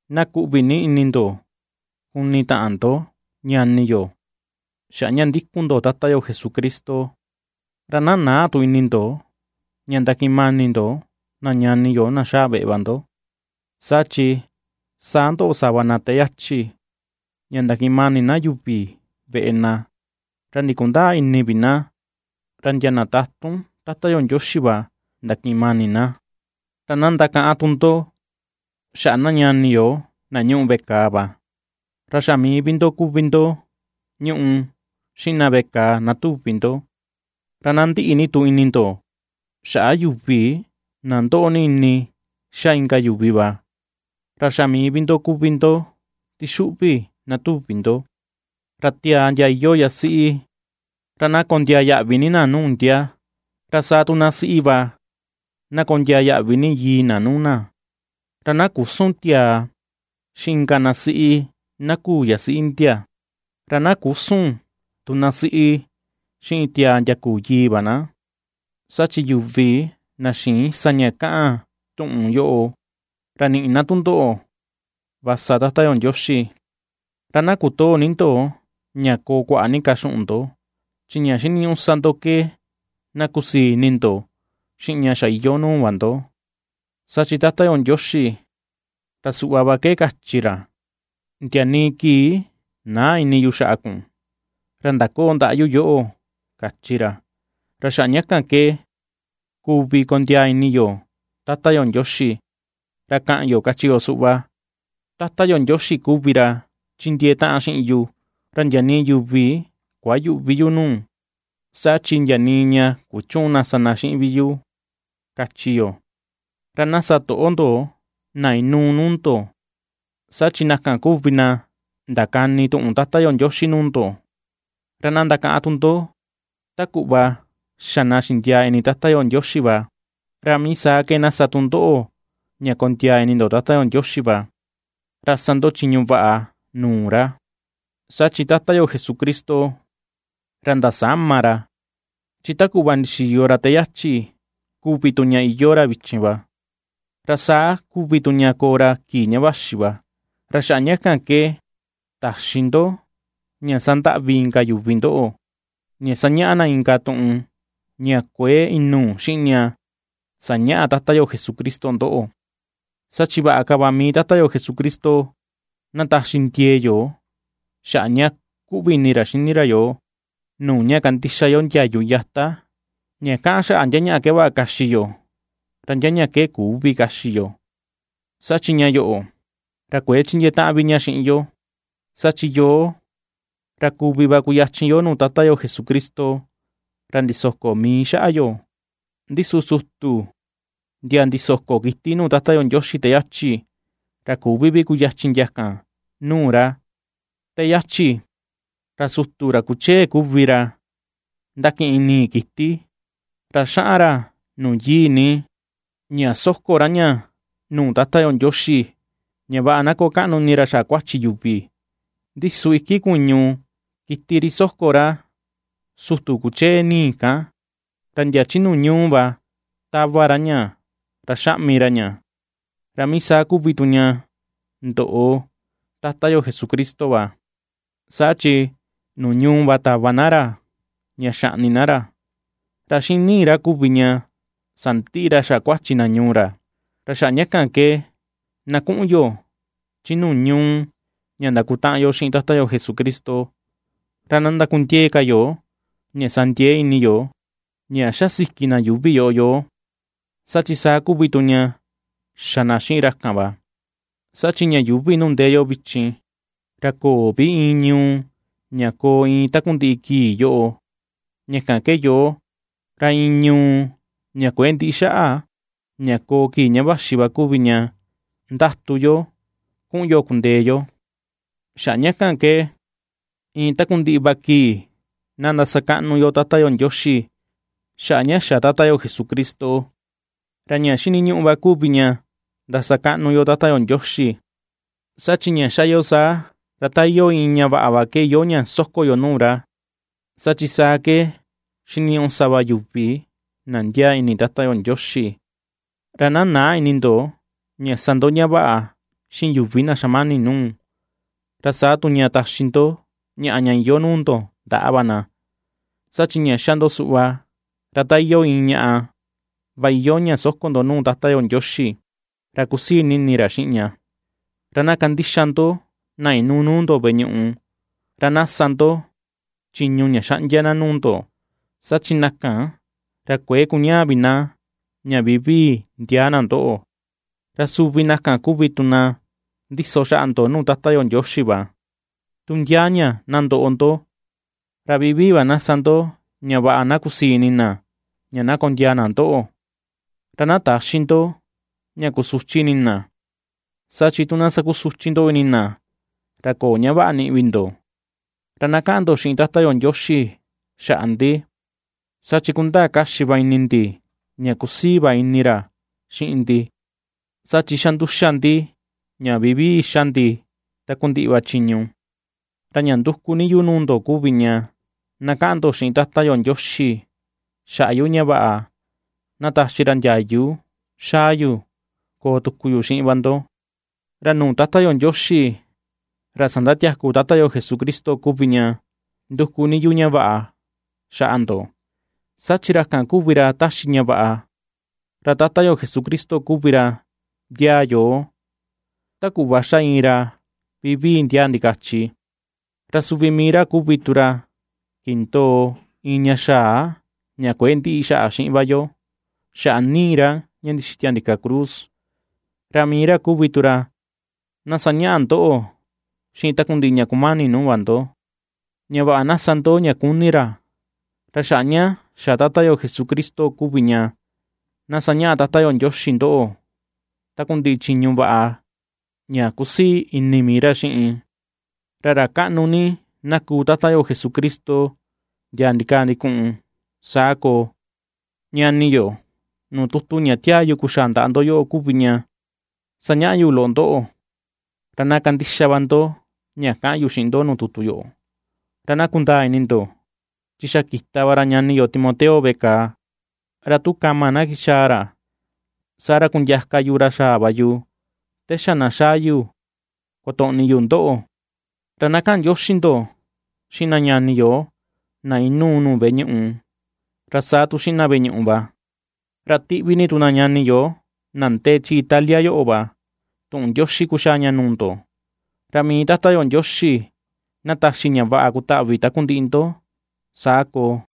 Na kuꞌvi ni ini ndo kuni taꞌan ndo, ñani yo, xaꞌa ña ndikun ndo Tata yo Jesucristo. Ra na näa tu ini ndo ña ndakiꞌin mani ndo na ñani yo na xaa veꞌe va ndo, saa chi saa ndoꞌo sava na te yachi, ña ndakiꞌin mani na yuvi veꞌe na, ra ndikundäa ini vi na, ra ndia na tatun Tata yo Ndioxi va ndakiꞌin mani na. Ra na ndakaꞌan tu ndo xaꞌa na ñani yo na ñuꞌu veꞌe kàà va, ra xa mii vi ndo kuvi ndo ñuꞌu xiꞌin na veꞌe kàà na tuvi ndo. Ra na ndiꞌi tu ini ndo xaꞌa yuvi na ndoꞌo ni ini ^xa inka yuvi va, ra xa mii vi ndo kuvi ndo tixuꞌvi na tuvi ndo. Ra tiaa ndia iyoo yasiꞌi ra na kondiaa yaꞌvi ni na nuu ndia, ra saa tu na siꞌi va na kondiaa yaꞌvi ni yii na nuu na, ra na küsun tiaa xiꞌin inka na siꞌi na küu yasiꞌi ndia, ra na küsun tu na siꞌi xiꞌin tiaa ndia küu yii va na; saa chi yuvi na xïin sa ña kaꞌan tuꞌun yoꞌo, ra niꞌi na tundoꞌo va sa Tata yo Ndioxi. Ra na kotöo ni ndo ña koo kuaꞌa ni ka xuꞌun ndo; chi ña xiniñuꞌu sa ndo ke na kusii ini ndo xiꞌin ña xa iyoo nuu va ndo, saa chi Tata yo Ndioxi, ra suꞌva va ke kachi ra: “Ndia nii kii näa ini yu xaꞌa kun, ra ndakoo ndaꞌa yu yoꞌo”, kachi ra. Ra xaꞌa ña kan ke kuvi kondiaa ini yo Tata yo Ndioxi, ra kaꞌan yo kachi yo suꞌva: Tata yo Ndioxi kuvi ra chindiee taꞌan xiꞌin yu; ra ndia nii yuvi kuayüꞌvi yu nuu, saa chi ndia nii ña kuchüun na sa na xiꞌin vi yu, ^kachi yo. Ra na sa toꞌo ndo na inuu nuu ndo, saa chi na kan kuvi na ndakani tuꞌun Tata yo Ndioxi nuu ndo; ra na ndakaꞌan tu ndo ta kuꞌva xa na ña xindiaa ni ini na Tata yo Ndioxi va, ra mii saa ke na sa tu ndoꞌo ña kondiaa ni ini ndo Tata yo Ndioxi va, ra sa ndo chiñu vaꞌa nuu ra. Saa chi Tata yo Jesucristo, ra ndasäma ra chi ta kuꞌva ndixiyo ra te yachi, kuvi tu ña iyoo ra vichin va, ra saa kuvi tu ña koo ra kii ña vaxi va. Ra xaꞌa ña kan ke täxi ndo ña sandaꞌvi inka yuvi ndoꞌo, ña sañaꞌa na inka tuꞌun ña kuëe inuu xiꞌin ña sañaꞌa Tata yo Jesucristo ndoꞌo. Saa chi vaꞌa ka va mii Tata yo Jesucristo na taxi ndiee yo xaꞌa ña kuꞌvi ini ra xini ra yoo, nuu ña kandixa yo ndiayu yata ña kaꞌan xaꞌa ndia ñaꞌa ke vaꞌa kaxi yo, ra ndia ñaꞌa ke küvi kaxi yo, saa chi ña yoꞌo, ra kuëe chindiee taꞌan vi ña xiꞌin yo. Saa chi yoo, ra kuvi va kuyachin yo nuu Tata yo Jesucristo, ra ndisoko mii xaꞌa yo. Ndi su sutu ndia ndisoko kiti nuu Tata yo Ndioxi te yachi, ra küvi vi kuyachin ndia kan nuu ra. Te yachi, ra sutu ra kuchee kuvi ra ^ndakiꞌin nii kiti ra xaꞌan ra Nuu Yii Ni, ña soko ra ña nuu Tata yo Ndioxi ña vaꞌa na koo kaꞌnu ini ra xaꞌa kuachi yuvi, ndi su iki kuñu kiti ri soko ra sutu kuchee nii kan, ra ndia chi nuu ñuu va tava ra ña, ra xaꞌmi ra ña. Ra mii saa kuvi tu ña ndoꞌo, Tata yo Jesucristo va, saa chi nuu ñuu va tava na ra, ña xaꞌni na ra, ra xiꞌin nii ra kuvi ña sandiꞌi ra xaꞌa kuachi na ñuu ra. Ra xaꞌa ña kan ke na kuꞌun yo chi nuu ñuu ña ndakutaꞌan yo xiꞌin Tata yo Jesucristo, ra na ndakundiee ka yo ña sa ndiee ini yo ña ^xasiki na yuuvi yoꞌo yoo, saa chi saa kuvi tu xa na xiꞌin ra kan va. Saa chi ña yuuvi nuu ndee yo vichin, ra köo vi iin ñuu ña koo iin takundiꞌi kii yoꞌo, ña kan ke yoo, ra iin ñuu ña kuëe ndiꞌi xaꞌa, ña koo kii ña vaxi va kuvi ña nduku yo kuꞌun yo kundee yo. Xaꞌa ña kan ke iin takundiꞌi va kii na ndasakaꞌnu yo Tata yo Ndioxi xaꞌa ña xa Tata yo Jesucristo. Ra ña xiniñuꞌu va kuvi ña ndasakaꞌnu yo Tata yo Ndioxi, saa chi ña xa yo saa, ra ta iyoo iin ñaꞌa va ke iyoo ña soko yo nuu ra. Saa chi saa ke xiniñuꞌu sa va yuvi na ndiaa ini Tata yo Ndioxi. Ra na näa ini ndo ña sa ndo ña vaꞌa xiꞌin yuvi na xamani nuu, ra saa tu ña taxi ndo ñaꞌa ña iyoo nuu ndo ndaꞌa va na; saa chi ña ^xa ndo suꞌva, ra ta iyoo iin ñaꞌa va iyoo ña soko ndo nuu Tata yo Ndioxi, ra kusii ni ini ra xiꞌin ña. Ra na kandixa ndo na inuu nuu ndo veꞌe ñuꞌu, ra na sa ndo chiñu ña xaꞌndia na nuu ndo; saa chi na kan, ra kuëe kuñaa vi na ña vivii ndiaa na ndoꞌo, ra suvi na kan kuvi tu na ndiso xaꞌa ndo nuu Tata yo Ndioxi va, tu ndia ña na ndoꞌo ndo. Ra vivii va na sa ndo ña vaꞌa na kusii ini na ña kondiaa na ndoꞌo, ra na täxi ndo ña kusuchi ini na. Saa chi tu na sakusuchi ndo ini na, ra köo ña vaꞌa niꞌi vi ndo. Ra na kaꞌan ndo xiꞌin Tata yo Ndioxi xaꞌa ndi, saa chi kundaa kaxi va ini ndi ña kusii va ini ra xiꞌin ndi, saa chi xa nduxa ndi ña vivii xa ndi takundiꞌi va chiñu. Ra ña nduku ni yu nuu ndo kuvi ña na kaꞌan ndo xiꞌin Tata yo Ndioxi xaꞌa yu ña vaꞌa na taxi ra ndiayu xaa yu koo tuku yu xiꞌin va ndo. Ra nuu Tata yo Ndioxi ra sandatiaku Tata yo Jesucristo kuvi ña nduku ni yu ña vaꞌa xaꞌa ndo, saa chi ra kan kuvi ra taxi ña vaꞌa, ra Tata yo Jesucristo kuvi ra ndiaa yoo, ta kuꞌva xa iin ra vivii ndiaa ndikachi, ra suvi mii ra kuvi tu ra kindoo iin ña xaa ña kuëe ndiꞌi xaꞌa xiꞌin va yo xaꞌa nii ra ña ndixitia ndika cruz, ra mii ra kuvi tu ra na sañaꞌa ndoꞌo xiꞌin takundiꞌi ña kumani nuu va ndo, ña vaꞌa na sa ndo ña kuni ra. Ra xaꞌa ña xa Tata yo Jesucristo kuvi ña na sañaꞌa Tata yo Ndioxi ndoꞌo takundiꞌi chiñu vaꞌa ña kusii ini mii ra xiꞌin. ¡Ra ra kaꞌnu ni na kuu Tata yo Jesucristo ndia ndikaa ndikuꞌun! Saa koo. Ñani yo, nuu tutu ña tiaa yu kuxaa ndaꞌa ndo yoꞌo kuvi ña sañaꞌa yu loꞌo ndoꞌo, ra na kandixa va ndo ña kaꞌan yu xiꞌin ndo nuu tutu yoꞌo. Ra na kundaa ini ndo, chi xa kita va ra ñani yo Timoteo veꞌe kàà, ra tu kama na kixaa ra, saa ra kundiaka yu ra xaa va yu te xa na xaa yu kotoꞌni yu ndoꞌo. Ra na kaꞌan ndioxi ndo xiꞌin na ñani yo na inuu nuu veꞌe ñuꞌu, ra saa tu xiꞌin na veꞌe ñuꞌu va. Ra tiꞌvi ni tu na ñani yo na ndee chi Italia yoꞌo va tuꞌun ndioxi kuxaa ña nuu ndo. Ra mii Tata yo Ndioxi na taxi ña vaꞌa kutaꞌvi takundiꞌi ndo. Saa koo.